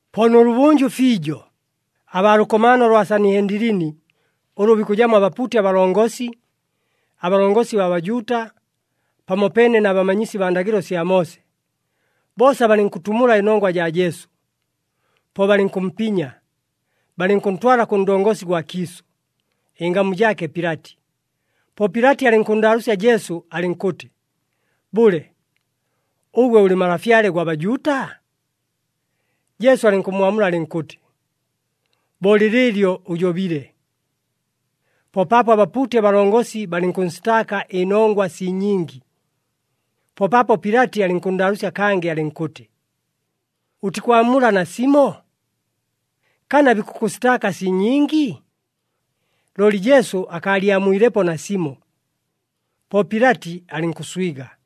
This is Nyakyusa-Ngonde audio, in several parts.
Po nʉlʉbʉnjʉ fiijo, abaa lʉkomaano lwa Sanihendilini ʉlʉ bikʉjamo abapuuti abalongosi, abalongosi baa Bajuuta, pamopeene na bamanyisi baa ndagɨlo sya Moose, boosa balɨnkʉtumula ɨnongwa jaa Jesu. Po balɨnkʉmpinya, balɨnkʉntwala kʉ ndongosi gwa kiisʉ, ɨngamu jaake Pilati. Po Pilati alɨnkʉnndaalʉʉsya Jesu alɨnkʉtɨ, “Bʉle, ʉgwe ʉlɨ Malafyale gwa Bajuuta?” Jesu alɨnkʉmmwamula alɨnkʉtɨ, “Bo lɨlɨɨlyo ʉjobile.” Po paapo abapuuti abalongosi balɨnkʉnsitaaka ɨnongwa sii nyingi. Po paapo Pilati alɨnkʉnndaalʉʉsya kangɨ alɨnkʉtɨ, “Ʉtikwamula nasimo? Kana bikʉkʉsitaaka sii nyingi?” Looli Jesu akaalyamwilepo nasimo. Po Pilati alɨnkʉswiga.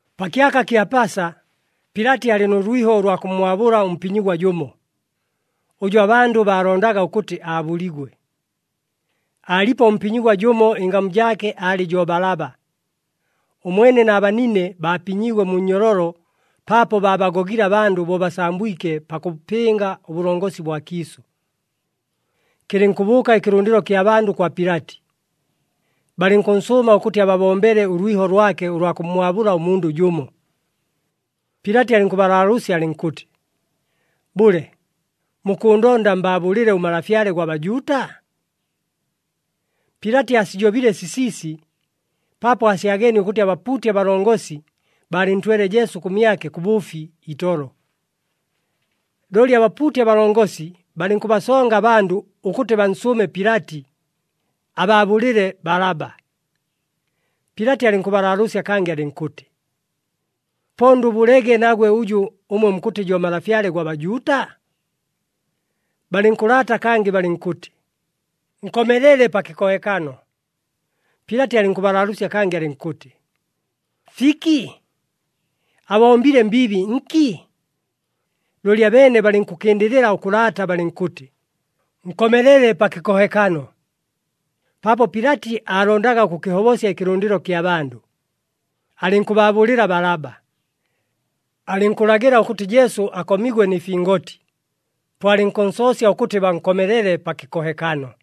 Pa kyaka kya Pasa, Pilati aalɨ nʉ lwiho ʉlwa kʉmmwabʉla ʉmpinyigwa jʉmo, ʉjʉ abandʉ baalondaga ʉkʉtɨ aabʉligwe. Aalipo ʉmpinyigwa jʉmo ɨngamu jaake aalɨ jo Balaba. Ʉmwene na banine baapinyiigwe mu nnyololo paapo baabagogile abandʉ bo basambwike pakʉpɨnga ʉbʉlongosi bwa kiisʉ. Kɨlɨnkʉbʉʉka ɨkɨlʉndɨlo kya bandʉ kwa Pilati. Balɨnkʉnsʉʉma ʉkʉtɨ ababombele ʉlwiho lwake ʉlwa kʉmmwabʉla ʉmundʉ jʉmo. Pilati alɨnkʉbalaalʉʉsya alɨnkʉtɨ, “Bʉle, mukʉʉndonda mbaabʉlɨle ʉMalafyale gwa Bajuuta?” Pilati aasijobile sisiisi paapo aasyageenie ʉkʉtɨ abapuuti abalongosi baalɨntwele Jesu kʉmyake kʉ bʉʉfi itolo. Looli abapuuti abalongosi balɨnkʉbasonga abandʉ ʉkʉtɨ bansʉʉme Pilati, abaabʉlɨle Balaba. Pilati alɨnkʉbalaalʉʉsya kangɨ alɨnkʉtɨ, “Po ndʉbʉlege nagwe ʉjʉ ʉmwe mukʉtɨ jo Malafyale gwa Bajuuta?” Balɨnkʉlaata kangɨ balɨnkʉtɨ, “Nkomelele pa kɨkohekano!” Pilati alɨnkʉbalaalʉʉsya kangɨ alɨnkʉtɨ, “Fiki? Abombile mbiibi nki?” Looli abeene balɨnkʉkɨndɨlɨla ʉkʉlaata balɨnkʉtɨ, “Nkomelele pa kɨkohekano!” Paapo Pilati aalondaga ʉkʉkɨhobosya ɨkɨlʉndɨlo kya bandʉ, alɨnkʉbaabʉlɨla Balaba. Alɨnkʉlagɨla ʉkʉtɨ Jesu akomigwe nɨ fingoti, po alɨnkʉnsoosya ʉkʉtɨ bankomelele pa kɨkohekano.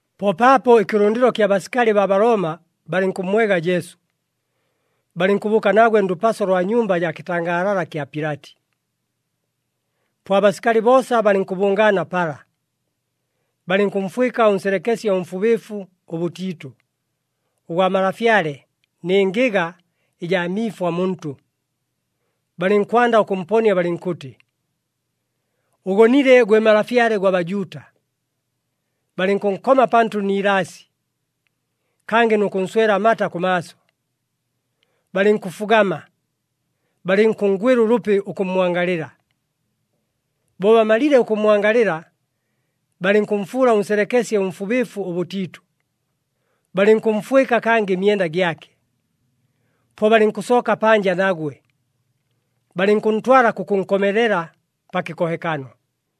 Po paapo ɨkɨlʉndɨlo kya basikali baa Balooma balɨnkʉmmwega Jesu, balɨnkʉbʉʉka nagwe ndʉpaso lwa nyumba jaa kɨtangaalala kya Pilati. Po abasikali boosa balɨnkʉbʉngaana pala. Balɨnkʉmfwɨka ʉnselekesye ʉmfubɨɨfu ʉbʉtiitʉ, ʉgwa malafyale, nɨ ngɨga ɨjaa miifwa muntʉ. Balɨnkwanda ʉkʉmponia balɨnkʉtɨ, “Ʉgonile, gwe Malafyale gwa Bajuuta.” Balɨnkʉnkoma pantʉ ni ilaasi, kangɨ nʉ kʉnswela amata kʉmaaso. Balɨnkʉfugama, balɨnkʉnngwɨla ʉlʉpi ʉkʉmmwangalɨla. Bo bamalile ʉkʉmmwangalɨla, balɨnkʉmfuula ʉnselekesye ʉmfubɨɨfu ʉbʉtiitʉ, balɨnkʉmfwɨka kangɨ ɨmyenda gyake. Po balɨnkʉsooka panja nagwe, balɨnkʉntwala kʉkʉnkomelela pa kɨkohekano.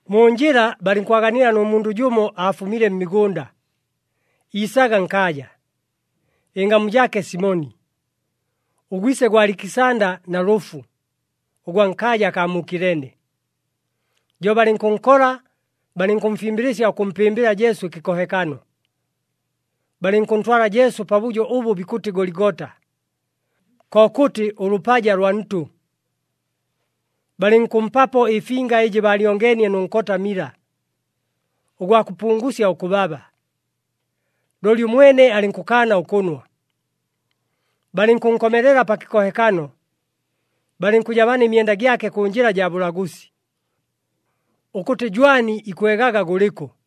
Mu njɨla balɨnkwaganila nʉ mundʉ jʉmo aafumile mmigʉnda, iisaga nkaaja. Ɨngamu jaake Simoni, ʉgwise gwa Alikisanda na Lʉfu, ʉgwa nkaaja akaa mu Kilene. Jo balɨnkʉnkola balɨnkʉmfimbɨlɨsya ʉkʉmpɨmbɨla Jesu ɨkɨkohekano. Balɨnkʉntwala Jesu pabʉjo ʉbʉ bikʉtɨ Goligota, kokʉtɨ ʉLʉpaja lwa Ntʉ. Balɨnkʉmpapo ɨfinga ɨjɨ baalyongeenie nʉ nkota mila, ʉgwa kʉpungusya ʉkʉbaba, looli ʉmwene alɨnkʉkaana ʉkʉnwa. Balɨnkʉnkomelela pa kɨkohekano, balɨnkʉjabana ɨmyenda gyake kʉ njɨla jaa bʉlagʉsi, ʉkʉtɨ jwani ikwegaga gʉlɨkʉ.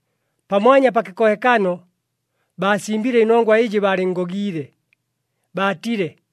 Pamwanya pa kɨkohekano, baasimbile ɨnongwa ɨjɨ baalɨnngogiile, baatile,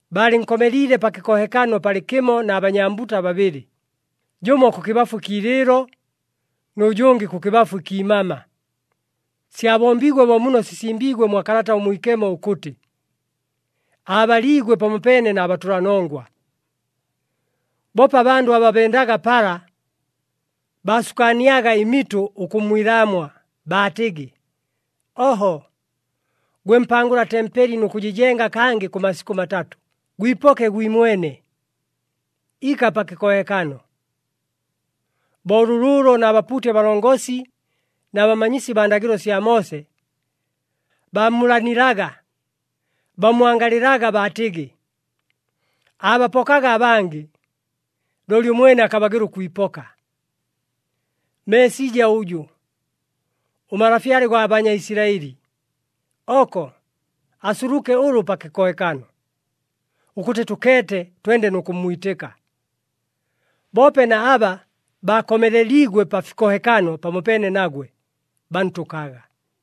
Baalɨnkomeliile pa kɨkohekano palɨkɨmo na banyambuta babɨlɨ, jʉmo kʉkɨbafu ɨkiilɨɨlo, nʉ jʉngɨ kʉkɨbafu ɨkiimama. [ Syabombiigwe bo muno sisimbiigwe mwa Kalata ʉMwikemo ʉkʉtɨ, “Aabaliigwe pamopeene na batʉlanongwa.”] Boope abandʉ aba bendaga pala, baasukaaniaga ɨmitʉ ʉkʉmmwilaamwa, baatɨgɨ, “Oho! Gwe mpangʉla tempeli nʉ kʉjɨjenga kangɨ kʉ masikʉ matatʉ, gwipoke gwimwene! Ika pa kɨkohekano!” Bo lʉlʉʉlo na bapuuti abalongosi na bamanyisi baa ndagɨlo sya Moose, baamulanilaga, bammwangalɨlaga baatɨgɨ, “Aabapokaga abangɨ, looli ʉmwene akabagɨla ʉkwipoka. Meesija ʉjʉ, ʉMalafyale gwa Banyaisilaɨli, oko asuluke ʉlʉ pa kɨkohekano, ʉkʉtɨ tʉkeete twende nʉ kʉmmwitɨka!” Boope na aba baakomeleliigwe pa fikohekano pamopeene nagwe, bantʉkaga.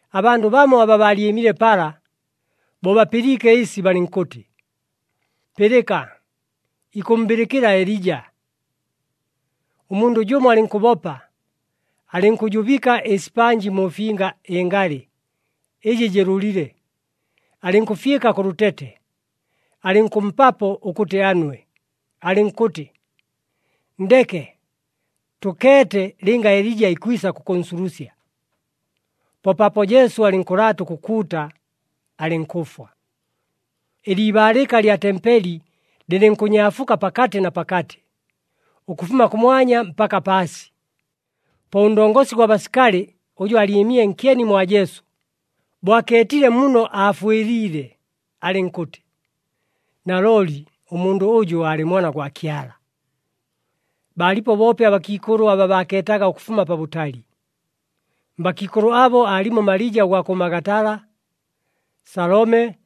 Abandʉ bamo aba baalyɨmile pala, bo bapɨliike ɨsi balɨnkʉtɨ, “Pɨlɨka! Ikʉmmbɨlɨkɨla Elija.” Ʉmundʉ jʉmo alɨnkʉbopa, alɨnkʉjubɨka ɨsipanji mu finga ɨngalɨ, ɨjɨ jɨlʉlile, alɨnkʉfyɨka kʉ lʉtete, alɨnkʉmpapo ʉkʉtɨ anwe, alɨnkʉtɨ, “Nndeke! Tʉkeete lɨnga Elija ikwisa kʉkʉnsulusya.” Po paapo Jesu alɨnkʉlaata ʉkʉkuuta, alɨnkʉfwa. Ɨliibaalɨka lya tempeli lɨlɨnkʉnyaafuka pakatɨ na pakatɨ, ʉkʉfuma kʉmwanya mpaka paasi. Po ʉndongosi gwa basikali ʉjʉ aalyɨmile nkyeni mwa Jesu, bo akeetile muno aafwɨliile, alɨnkʉtɨ, “Nalooli ʉmundʉ ʉjʉ aalɨ Mwana gwa Kyala!” Baalipo boope abakiikʉlʉ aba baakeetaga ʉkʉfuma pabʉtali. Mbakiikʉlʉ abo aalimo Malija ʉgwa kʉ Magatala, Salome,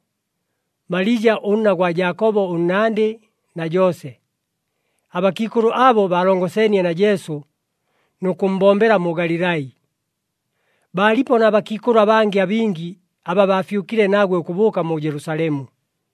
Malija ʉnna gwa Jaakobo ʉnnandɨ na Joose. Abakiikʉlʉ abo baalongoseenie na Jesu nʉ kʉmmbombela mu Galilai. Baalipo na bakiikʉlʉ abangɨ abingi aba baafyʉkile nagwe ʉkʉbʉʉka mu Jelusalemu.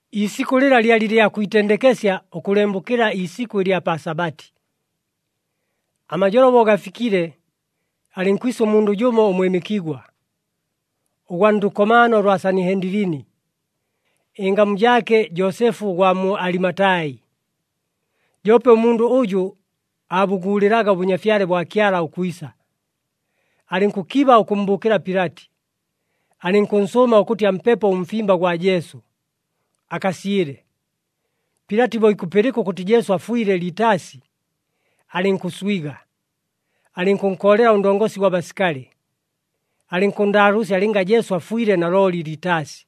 Iisikʉ lɨla lyalɨ lya kwitendekesya, ʉkʉlembʉkɨla iisikʉ ɨlya pa Sabati. Amajolo bo gafikile, alɨnkwisa ʉmundʉ jʉmo ʉmwɨmɨkigwa, ʉgwa ndʉkomaano lwa Sanihendilini, ɨngamu jaake Joosefu ʉgwa mu Alimatai. Joope ʉmundʉ ʉjʉ aabʉguulɨlaga ʉBʉnyafyale bwa Kyala ʉkwisa. Alɨnkʉkiba ʉkʉmmbʉʉkɨla Pilati, alɨnkʉnsʉʉma ʉkʉtɨ ampepo ʉmfimba gwa Jesu, akasyɨle. Pilati bo ikʉpɨlɨka ʉkʉtɨ Jesu afwile litaasi, alɨnkʉswiga, alɨnkʉnkoolela ʉndongosi gwa basikali, alɨnkʉnndaalʉʉsya lɨnga Jesu afwile nalooli litaasi.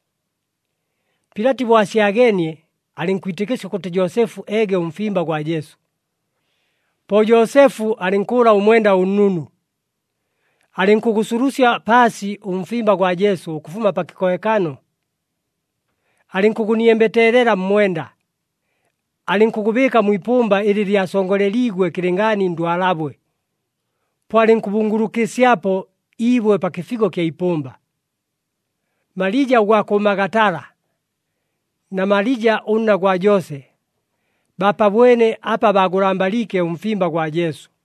Pilati bo asyageenie, alɨnkwitɨkɨsya ʉkʉtɨ Joosefu eege ʉmfimba gwa Jesu. Po Joosefu alɨnkʉʉla ʉmwenda ʉnnunu. Alɨnkʉgʉsulusya paasi ʉmfimba gwa Jesu ʉkʉfuma pa kɨkohekano. Alɨnkʉgʉniembeteelela mmwenda, alɨnkʉgʉbɨɨka mwi ipʉmba ɨlɨ lyasongoleliigwe kɨlɨngaani ndwalabwe. Po alɨnkʉbungulukɨsyapo iibwe pa kɨfigo ɨkya ipʉmba. Malija ʉgwa kʉ Magatala na Malija ʉnna gwa Joose, baapabwene apa baagʉlambaliike ʉmfimba gwa Jesu.